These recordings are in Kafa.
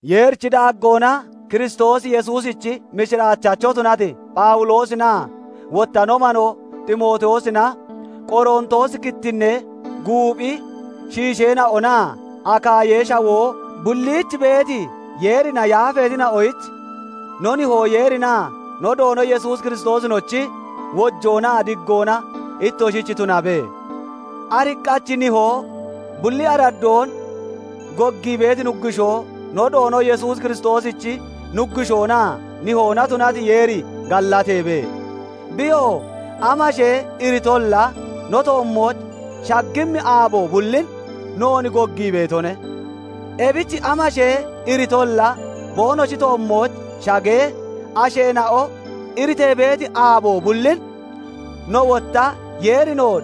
Yeerichi daaggoona Kiristoos Yesuusichi mishiraachacho tunati Phawuloosinaa wotta no manoo Ximootiyoosina; Qorontoosi kittinnee guuphi shiisheena'onaa Akaayee Shawoo bulliich beeti, Yeerina yaafeetina'onoyich; No Nihoo Yeerinaa no Doono Yesuus Kiristoosinochi wojoonaa diggoona ittoshich tunabe. Ariqqachi Nihoo, bulli araddoon goggii beeti Nuggushoo, no Doono Yesuus Kiristoosichi Nuggushoonaa Nihoona tunati Yeeri gallateebe. Biyoo amashee iritolla no toommooch shaggimmi aabo bullin noon goggii beetone. Ebich amashee iritolla boonoshi toommooch shagee, asheena'o iritee beeti aabo bullin, no wotta Yeeri noon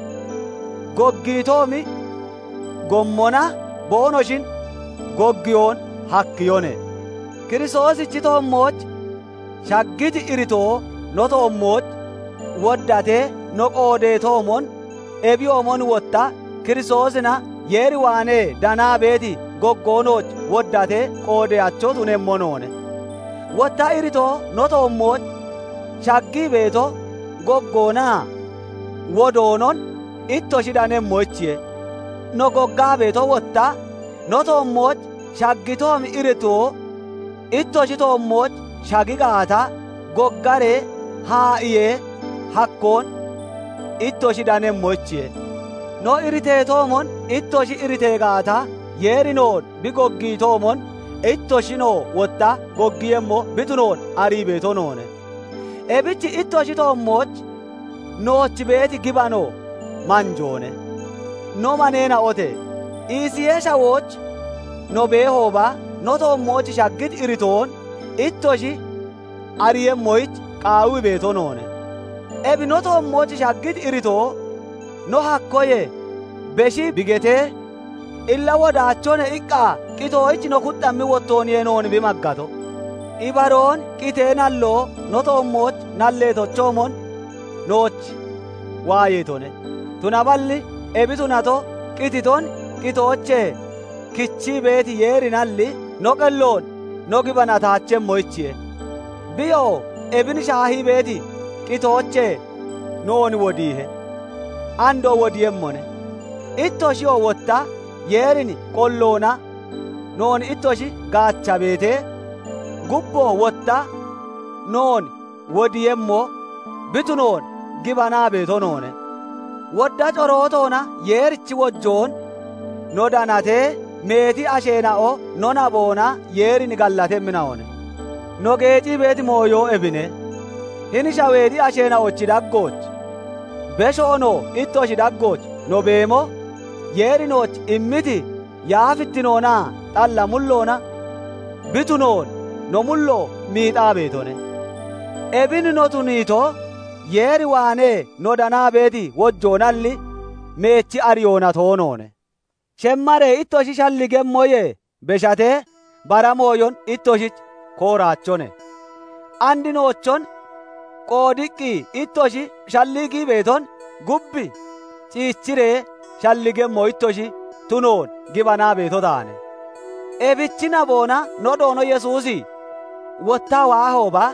goggiitoomi gommona boonoshin goggiyoon hakkiyone. Kiristoosichi toommooch shaggiti iritoo no toommooch woddatee no qoodeetoomon, ebiyoomon wotta Kiristoosina Yeer waanee danaa beeti goggo nooch woddatee qoodeyacho tunemmo noone. Wotta iritoo no toommooch shaggii beeto, goggoonaa wodoonon ittoshi danemmoyichiye; no goggaa beeto wotta, no toommooch shaggitoomi iritoo ittoshi toommooch shagi gaata, goggaree haa'iyee hakkoon ittoshi danemmoyichiye. No iriteetoomon ittoshi iritee gaata, Yeeri noon bi goggiitoomon ittoshinoo wotta goggiiyemmo bi tunoon arii beeto noone; ebich ittoshi toommooch nooch beeti gibano manjoone. No maneena'ote! Isiyee Shawooch no beehooba, no toommooch shaggiti iritoon ittoshi ariiyemmoyich qaawii beeto noone. Ebi no toommooch shaggiti iritoo no hakkoyee beshii bi getee, Illa wodaachone iqqa qitoyich no kuxxammi wottooniye noon bi maggato. Ibaroon qitee nalloo no toommooch nalleetochoomon nooch waayeetone; tunaballi ebi tunato, qititon qitoochee kichii beeti Yeerinalli, no qelloon no gibanataachemmoyichiye. Biyoo ebin shaahii beeti qitoochee noon wodiihe; andoo wodiiyemmone; ittoshiyoo wotta Yeerin qolloona noon ittoshi gaacha beetee, gubboo wotta noon wodiiyemmo bi tunoon gibanaa beeto noone; wodda corootoona Yeerichi wojoon no danatee, meeti asheena'o no naboona Yeerin gallatemmina'one. No geecii beeti mooyo ebine; hini shaweexi asheena'ochi daggooch, beshoonoo ittoshi daggooch no beemo, Yeeri nooch immiti yaafittinoonaa xalla mulloona bi tunoon no mullo miixaa beetone. Ebin no tuniito, Yeer waanee no danaa beeti wojoonalli, meechi ariyoona toonoone. Shemmaree ittoshi shalligemmoyee beshatee bara mooyon ittoshich kooraachone; and noochon qoodiqqi ittoshi shalligii beeton gub ciichiree shalligemmo ittoshi tunoon gibanaa beeto taane; ebichi naboona no Doono Yesuusi wottaa waahooba,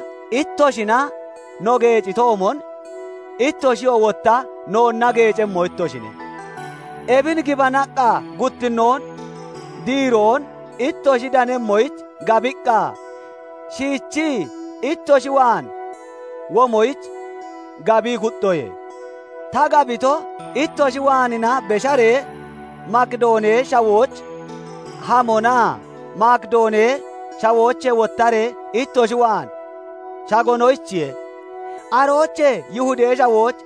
ittoshina no geecitoomon, ittoshiyoo wotta noonna geecemmo ittoshine. Ebin gibanaqqa, guttinnoon diiroon ittoshi danemmoyich gabiqqa, shiichii ittoshi waan womoyich gabii kuxxoye. Ta gabito, ittoshi waanina besharee Makidoonee Shawooch hamonaa Makidoonee Shawoochee wottaree ittoshi waan shagonoyichiye; aroochee Yihudee Shawooch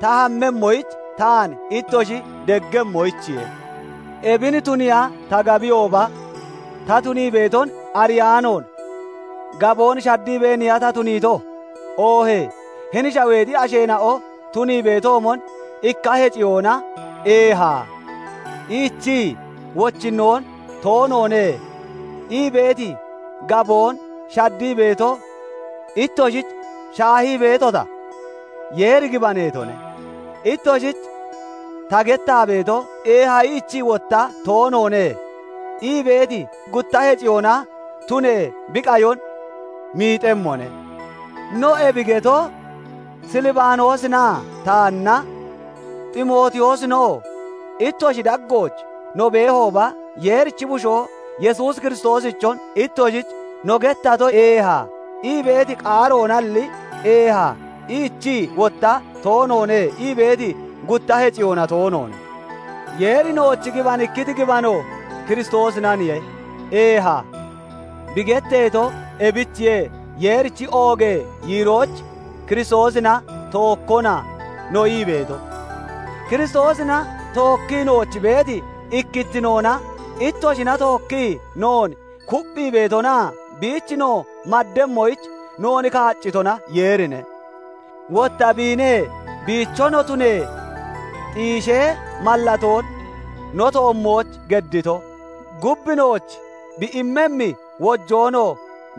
ta hammemmoyich taan ittoshi deggemmoyichiye. Ebin tuniiya ta gabiyooba, ta tunii beeton ariyaanoon gaboon shaddiibeeniya ta tuniito? Oohee hini shaweexi asheena'o tunii beetoomon, ikka heciyoona "Eeha" iichii, wochinnoon "Toonoone" ii beeti gaboon shaddii beeto ittoshich shaahii beetota? Yeeri gibaneetone; ittoshich ta gettaa beeto "Eeha" iichii, wotta "Toonoone" ii beeti gutta heciyoona tunee bi qayon miixemmone. No, ebi geto Silbaanoosinaa taanna, Ximootiyoosinoo, ittoshi daggooch no beehooba, Yeerichi Bushoo Yesuus Kiristoosichon ittoshich no gettato "Eeha" ii beeti qaaroonalli, "Eeha" iichii, wotta "Toonoone" ii beeti gutta heciyoona toonoone. Yeeri nooch gibanikkiti gibano Kiristoosinaniye "Eeha" bi getteeto; ebichiye Yeerichi oogee yiiroyich Kiristoosina "Tookkona" no ii beeto. Kiristoosina tookkii nooch beeti ikkittinoona ittoshina tookkii noon kupphii beetonaa biich no maddemmoyich noon kaaccitona Yeerine. Wotta biine biicho no tunee xiishee mallatoon no toommooch geddito, gub nooch bi immemmi wojoonoo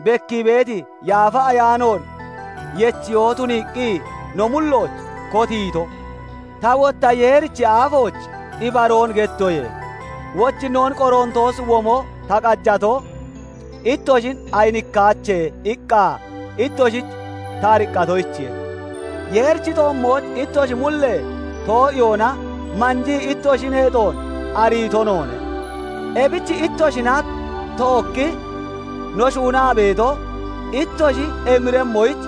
bekkii beeti Yaafa Ayaanoon yechiyoo tuniiqqi no mullooch kotiito. Ta wotta Yeerichi aafooch ibaroon gettoye; wochinnoon Qorontoos womo ta qajato, ittoshin ayinikkaache iqqa ittoshich ta ariqqatoyichiye. Yeerichi toommooch ittoshi mullee too'iyoona manjii ittoshi neexoon ariito noone; ebich ittoshina tookkii no shuunaa beeto ittoshi emiremmoyich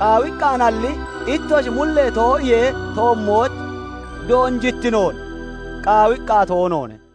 qaawiqqaanalli, ittoshi mullee too'iyee toommooch doonjittinoon qaawiqqa toonoone.